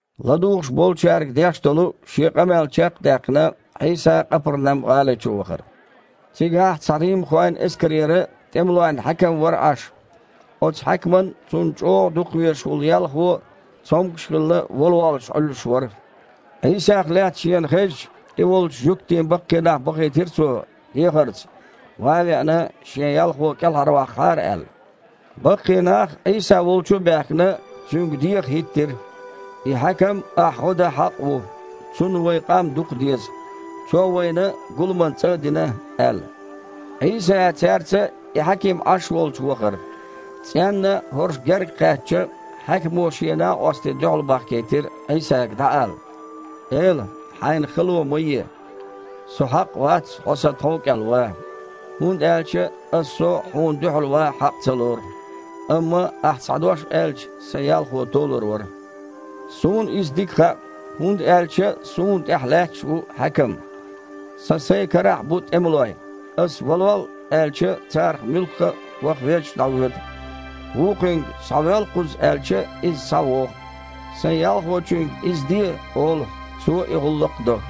ЛадугІуш болчаьрга деш долу Шен къамел чекх а даьккхина, Іийса Къапарнам-гІали чу вахара. Цигахь цхьа римхойн эскарера тІемалойн хьаькам вара Іаш. Оцу хьаькаман цунна чІогІа дукхавезаш волу ялхо, цомгуш а хилла, вала воллуш Іуьллуш вара. Іийсах лаьцна шена хезча, И волчу жуьгтийн баккхий нах бахийтира цо дехарца, ван а веана, шен ялхо кІелхьарваккхахьара аьлла. Баккхий нах, Іийса волчу а баьхкина, Цуьнга деха хІиттира: «И хьаькам Ахь гІо дан хьакъ ву. Цунна вайн къам дукхадеза. Цо вайна гуламан цІа а дина», – аьлла. Іийса цаьрца и хьаькам Іаш волчу вахара. ЦІенна хІорш гергакхаьчча, хьаькамо шен накъостий дуьхьал бахкийтира Іийсага дІаала: «Эла! Хьайна хало ма е! Со хьакъ вац Хьо сан тхов кІел ван. ХІунда аьлча ас со Хьуна дуьхьал ван а хьакъ ца лору. Амма Ахь цхьа дош аьлча, сан ялхо толур вара. Иза суна дика хаьа, хІунда аьлча суна тІехь лаьтташ а ву хьаькам. Сан сайн карахь а бу тІемалой. Аса „Валол!“ аьлча, царах муьлхха а ваха веззачу дІавоьду. Вукхуьнга „Схьавоьл кхуза!“ аьлча, иза схьавогІу. Сайн ялхочуьнга „Иза де!“ олу, цо и гІуллакх до».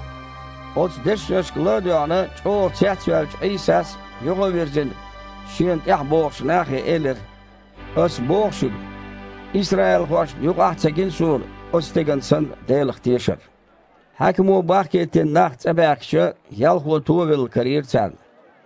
Оцу дешнашка ла а доьгІна, чІогІа цецваьллачу Іийсас, юха а вирзина, Шена тІаьхьа богІучу нахе элира: «Ас боху шуьга, исраилхошна юкъахь а ца гина Суна оцу стеган санна Делах тешар». Хьаькамо бахкийтина нах цІа баьхкича, ялхо товелла карийра царна.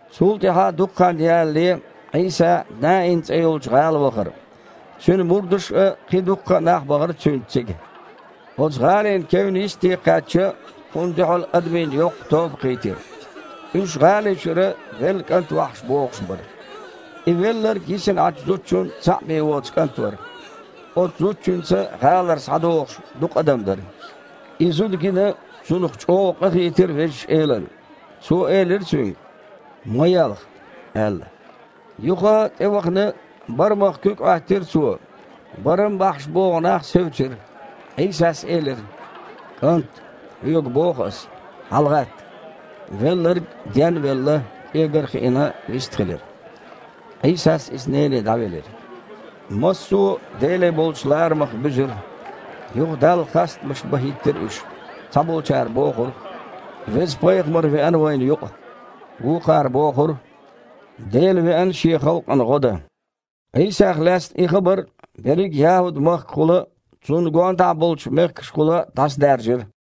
Цул тІаьхьа дукха хан ялале Іийса Наин цІе йолчу гІала вахара. Цуьнан мурдаш а, кхин дуккха а нах бахара Цуьнца цига. Оцу гІалин кевнна йистте кхаьчча, Кхунна дуьхьал адамийн йоккха тоба кхийтира. Уьш гІали чуьра велла кІант вахьаш богІуш бара. И велларг йисина Іачу зудчун цхьаъ бен воцу кІант вара. Оцу зудчуьнца гІалара схьадогІуш дукха адам дара. И зуда гина, цунах чІогІа къахийтира Везачу Элана. Цо элира цуьнга: «Ма елха!» – аьлла. Юха тІевахана барамах куьг Іоьттира Цо. Барам бахьаш богІу нах севцира. Іийсас элира: «КІант, хьоьга боху Ас: хьалагІатта!» Велларг, ден а велла, кІегар а хиина, вистхилира. Іийсас иза нене дІавелира. Массо а Деле болчу ларамах буьзира. Юха Далла хастамаш бан хІиттира уьш. Цхьаболчара бохура: «Веза пайхамар веана вайна юкъа». Вукхара бохура: «Дела веана Шен халкъана гІо дан». Іийсах лаьцна и хабар берриг ЯхІуд махкахула а, цунна гондахьа болчу мехкашкахула а дІасадаьржира.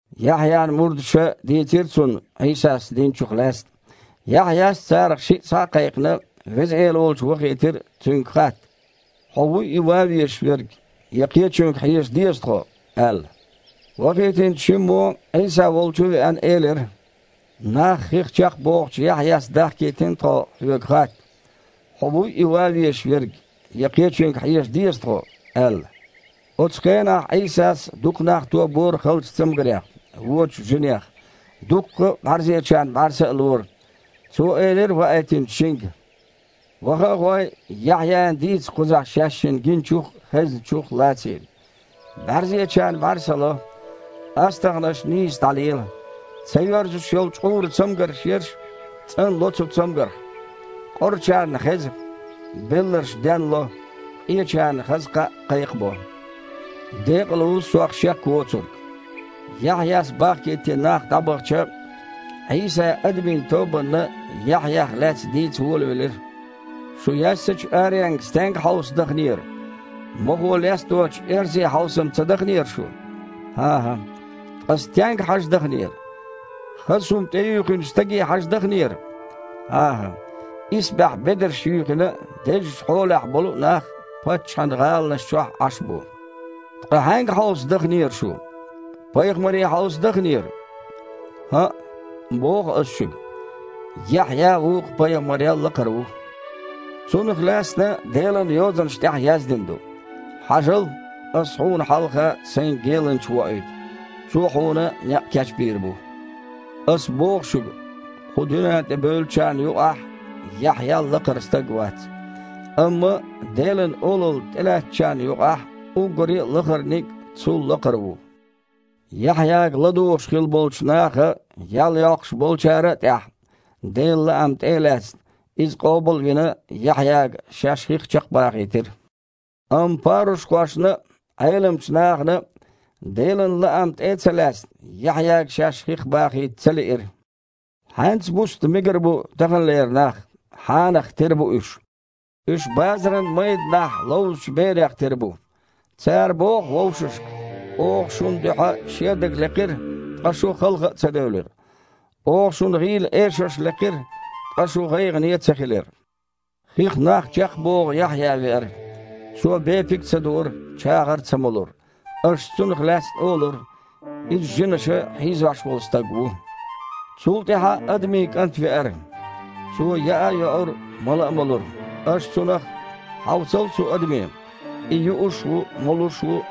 Яхьъян мурдаша дийцира цунна Іийсас динчух лаьцна. Яхьъяс, царах шиъ схьа а кхайкхина, Веза Эла волчу вахийтира Цуьнга хатта: «Хьо вуй и ван везаш верг, я кхечуьнга хьежа деза тхо?» – аьлла. Вахийтинчу шиммо, Іийса волчу а веана, элира: «Нах хих чекхбохучу Яхьъяс дахкийтина тхо Хьоьга хатта: „Хьо вуй и ван везаш верг, я кхечуьнга хьежа деза тхо?“ – аьлла». Оцу хенахь Іийсас дукха нах тобора халчу цамгарех, вочу жинех, дуккха а бІаьрзечарна бІаьрса а лора. Цо элира ваийтинчу шинга: «Ваха а гІой, Яхьъяна дийца кхузахь шаьшшинна гиначух а, хезначух а лаций. БІаьрзечарна бІаьрса ло, астагІнаш нийса дІалела, ца йоьрзуш йолу чкъуран цамгар ерш цІанло цу цамгарх, къорачарна хеза, белларш денло, къечарна хаза кхаъ кхайкхабо. Декъала ву Сох шек воцург». Яхьъяс бахкийтина нах дІабахча, Іийса адамийн тобанна Яхьъях лаьцна дийца волавелира: «Шу яьссачу аренга стенга хьовса даханера? Мохо лесточу эрзе хьовса-м ца даханера шу? ХІан-хІа. Ткъа стенга хьажа даханера? Хаза хІума тІеюьйхинчу стаге хьажа дахнера? ХІан-хІа. Исбаьхьа бедарш юьйхина а, дезачу хьолахь болу а нах паччахьан гІаланаш чохь Іаш бу. Ткъа хьаьнга хьовса дахнера шу? Пайхамаре хьовса дахнера? ХІаъ, боху Аса шуьга. Яхьъя вукху пайхамарел лакхара ву. Цунах лаьцна Делан Йозанаш тІехь яздина ду: „Хьажал! Ас Хьуна хьалха Сайн геланча воуьйту. Цо Хьуна некъ кечбийр бу!“ Ас боху шуьга: кху дуьнен тІе бевллачарна юкъахь Яхьъял лакхара стаг вац. Амма Делан Олалла тІелаьцначарна юкъахь уггаре а лахарниг а цул лакхара ву. Яхьъяга ладугІуш хилла болчу наха, ял йоккхуш болчара а тІехь, Делан лаам тІе а лаьцна, Иза къобал а вина, Яхьъяга шаьш хих чекхбахийтира. Амма парушхошна а, Іеламчу нахана а, Делан лаам тІе а ца лаьцна, Яхьъяга шаьш хих бахийта ца лиира. Хьаьнца буста мегар бу таханлера нах? Хьанах тера бу уьш? Уьш базаран майданахь ловзучу берех тера бу. Цара боху вовшашка: „Оха шун дуьхьа шедаг лекхира, ткъа шу халха а ца девлира! Оха шуна гІийла эшарш лекхира, ткъа шу гІайгІане а ца хилира!“ Хих нах чекхбоху Яхьъя веара. Цо бепиг ца дуура, чагІар ца молура. Аш цунах лаьцна олура: „Иза жинаша хьийзош волу стаг ву“. Цул тІаьхьа Адамийн КІант веара. Цо яа а йоура, мала а молура. Аш Цунах: „Хьовсал цу адаме! И юуш ву, молуш ву,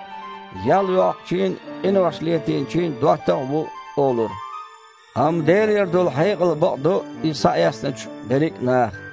ял йоккхучийн а, къинош летийначийн а доттагІа ву“, – олура. Амма Делера долу хьекъал бакъдо и схьаэцначу берриг а наха».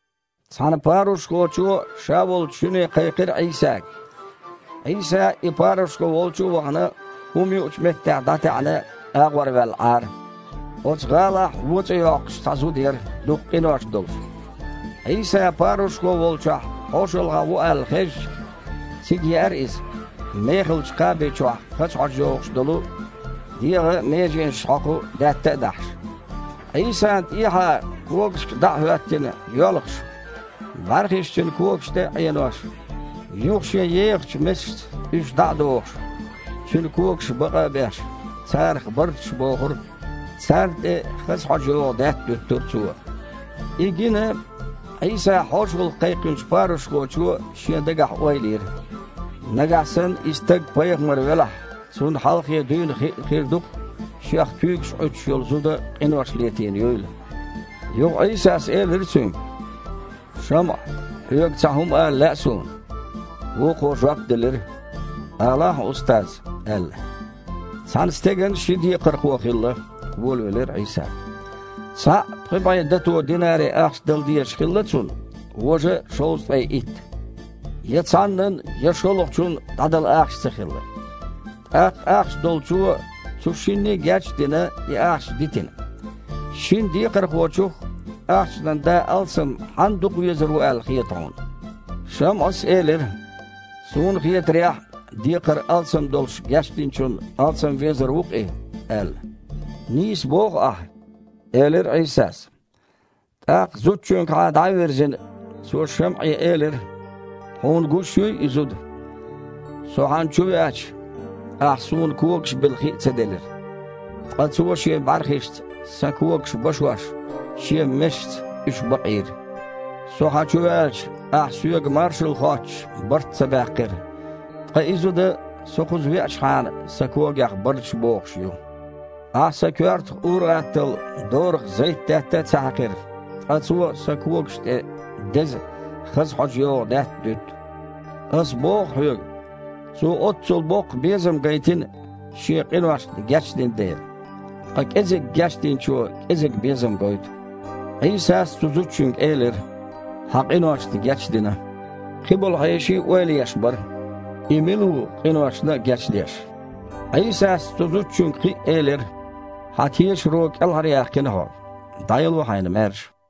Цхьана парушхочо ша волчу шуьне кхайкхира Іийсага. Іийса, и парушхо волчу а вахана, хІума юучу меттехь дІатаьІна, агІорваьлла Іара. Оцу гІалахь вон цІе йоккхуш, цхьа зуда яра, дукха къинош долуш. Іийса парушхо волчохь хьошалгІахь ву аьлла хезча, цига еара иза, мехалчу кхаби чохь хаза хьожа йогІуш долу, дегІан меженашна хьокху даьтта а дахьаш. Іийсана тІехьа, когашка дІа а хІоьттина, йоьлхуш, бІаьрхиш Цуьнан когаш тІе а Іенош, юха шен ехачу месашца уьш дІа а дохуш, Цуьнан когаш бакъа а беш, царах барташ бохура, царна тІе хаза хьожа йогІу даьтта дуьттура цо. И гина, Іийса хьошалгІа кхайкхинчу парушхочо шен дагахь ойла йира: «Нагахь санна и стаг пайхамар велахь, Цунна хьалхе дуьйна хиъна хир ду-кх, Шех куьйгаш Іуьттуш йолу зуда къинош летийна юйла». Юха Іийсас элира цуьнга: «ШамІа, хьоьга цхьа хІума ала лаьа Суна». Вукхо жоп делира: «Алахьа, Устаз!» – аьлла. «Цхьана стеган ши декхархо хилла, – волавелира Іийса. – Цхьаъ пхи бІе дато динари-ахча дала дезаш хилла цунна, важа шовзткъе итт. Я цхьаннан, я шолгІачун дІадала ахча ца хилла. ТІаккха ахча долчо, цу шинне геч а дина, и ахча дитина. Шина декхархочух ахчанан да алсам хьанна дукхавезар ву аьлла хета хьуна?» ШамІас элира: «Суна схьахетарехь, декхар алсам долуш гечдинчунна алсам везар ву-кх и», – аьлла. «Нийса боху ахь», – элира Іийсас. ТІаккха, зудчуьнгахьа дІа а вирзина, Цо ШамІе элира: «Хьуна гуш юй и зуда? Со хьан чу веача, ахь Суна когаш била хи а ца делира, ткъа цо шен бІаьрхишца Сан когаш башош, шен месашца уьш бакъийра. Со хьан чу ваьлча, ахь, Соьга маршалла хоттуш, барт ца баьккхира, ткъа и зуда, Со кхуза веачахьана, Сан когех барташ бохуш ю. Ахь Сан коьртах ур-атталла дораха зайтдаьтта а ца хьаькхира, ткъа цо Сан когаш тІе деза, хаза хьожа йогІу даьтта дуьтту. Ас боху хьоьга: цо оццул боккха безам гайтина, шен къиношна гечдина дела. Ткъа кІезиг гечдинчо кІезиг безам гойту». Іийсас цу зудчуьнга элира: «Хьан къиношна гечдина». Кхиболу хьеший ойла еш бара: «И мила ву, къиношна а гечдеш?» Іийсас цу зудчуьнга кхин а элира: «Хьан тешаро кІелхьаръяьккхина хьо. ДІаяло хьайна маьрша».